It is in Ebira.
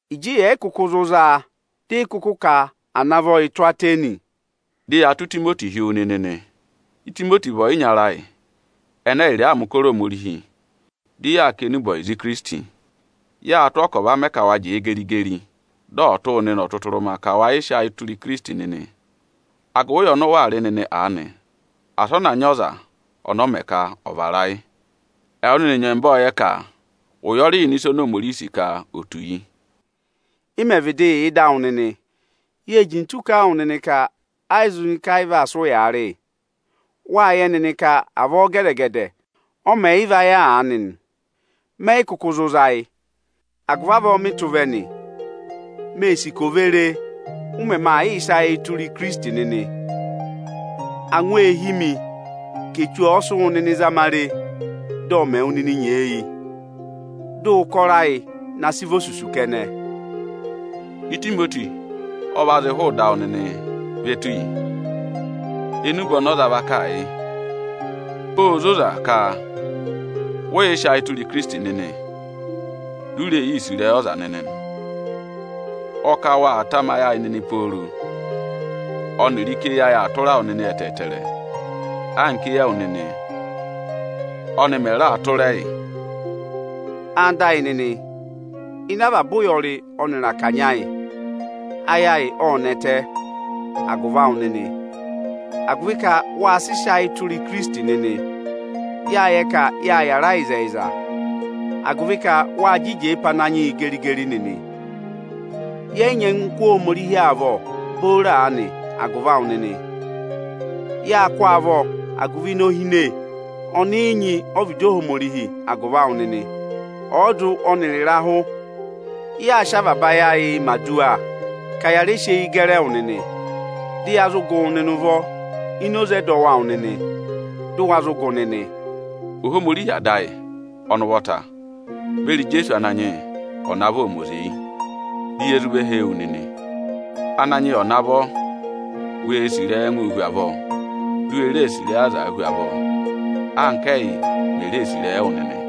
Ịjị yẹ̀ yị kụkụ zụ zaa, dị ị kụkụ ka à navọ yị tụ́ Atẹnị, dị ya tụ́ Itimoti hi wu nịnị nị. Itimoti vị ọyịnyara ayị, ẹnẹ ẹyịrịị aa mẹ̀ ụkọrọ Ohomorihi, dị yaa kà enube ọyịza Ikirisiti. Yâ tụ́ ọọ ka ọ̀ va mẹ ka wa jẹẹ geri-geri, dị ọ̀ tụ́ wụ nịnị ọtụtụrụma ka wa yịị sị ayịị tụra Ikirisiti nịnị, agụvị asị ana nyị ọza ana vara ayị ịnị awụ nịnị agụvị ụya ọnị ụ waa rị nịnị aanị. Ẹwụ nịnị nyẹmba ọ́ọ yẹ ka ụyọrị yà ịnị ịsa oni Ohomorihi sì ka ò tù yi. Ị mẹ̀ vịdị yà ịdị awụ nịnị, yée jintu kà a wụ nịnị ka ẹ yị zụ nyị ka ayị vaa sị ụyaa rị yị. Wáa yẹ nịnị ka avọọ gẹdẹ-gẹdẹ, ọ mẹ̀ yị va yà aanị nị. Mẹ yị kụkụ zụ za ayị; agụvị avọọ mị tụ́ vẹ nị. Mée sì ka ò ve re, ụ mẹmẹ aa yịị sị ayịị tụra Ikirisiti nịnị. Angwa ee hí mi ka Echu ọ sị wụ nịnị zama re, dị ọ mẹ wụ nịnị nyeeyi, dị ụkọrọ ayị na sị vị osusu kẹnẹ. Itimoti ọ va zị hụụ ịdị awụ nịnị ve tù yi. Enube ọnị ọ za va kà a yị, óo zoza ka vị ụ yị sị ayị tụra Ikirisiti nịnị, du u ree yii sì ịrẹyị ọza nịnị nị. Ọ kà waa tamayị ayị nịnị pooro, ọnịrị ka eyi ayị aa tụra wụ nịnị ẹtẹẹtẹrẹ, anka éyi ẹwụ nịnị ọnị mẹ̀ raa tụra ẹyị. Ẹwụ nịnị ẹyịnyara amị, ịnị avaba ụyọrị ọnịrị akanya ayị, ayị ayị ộ nẹtẹ agụvị awụ nịnị, agụvị ka wa sị sị ayị tụra Ikirisiti nịnị. Yáa yẹ ka yáa yàra ịzẹyịza, agụvị ka wa jị jẹẹ pe Ananyị yị geri-geri nịnị. Yẹ yị nyị ẹngụ kụ́ Ohomorihi avọ booro aanị agụvị awụ nịnị. Yaa kụ́ ọọ avọ agụvị inohine ọnị ị nyị ọ́vịdị Ohomorihi agụvị awụ nịnị. Ọọdụ ọnịrị ịrahụ, yaa sị avaba ayị ayịị mẹ̀ aduwa ka ya rẹ sị eyi gẹrị ẹwụ nịnị, dị ya zụ gụ wụ nịnị ụvọ ini oze ẹdọwụ awụ nịnị, dụ wa zụ gụ nịnị nị. Ohomorihi Ada ayị ọnị ụvọta beri Ijeesu Ananyị yị ọ̀ navọ ọ̀ mẹ oze yị, di ye zụ ve hee wu nịnị! Ananyị yị ọ̀ navọ wee sì ịrẹyị ẹngụụ hu avọọ, di u we ree sì ịrẹyị azaa hu avọọ, anka ẹ́yị mè ree sì ịrẹyị ẹwụ nịnị.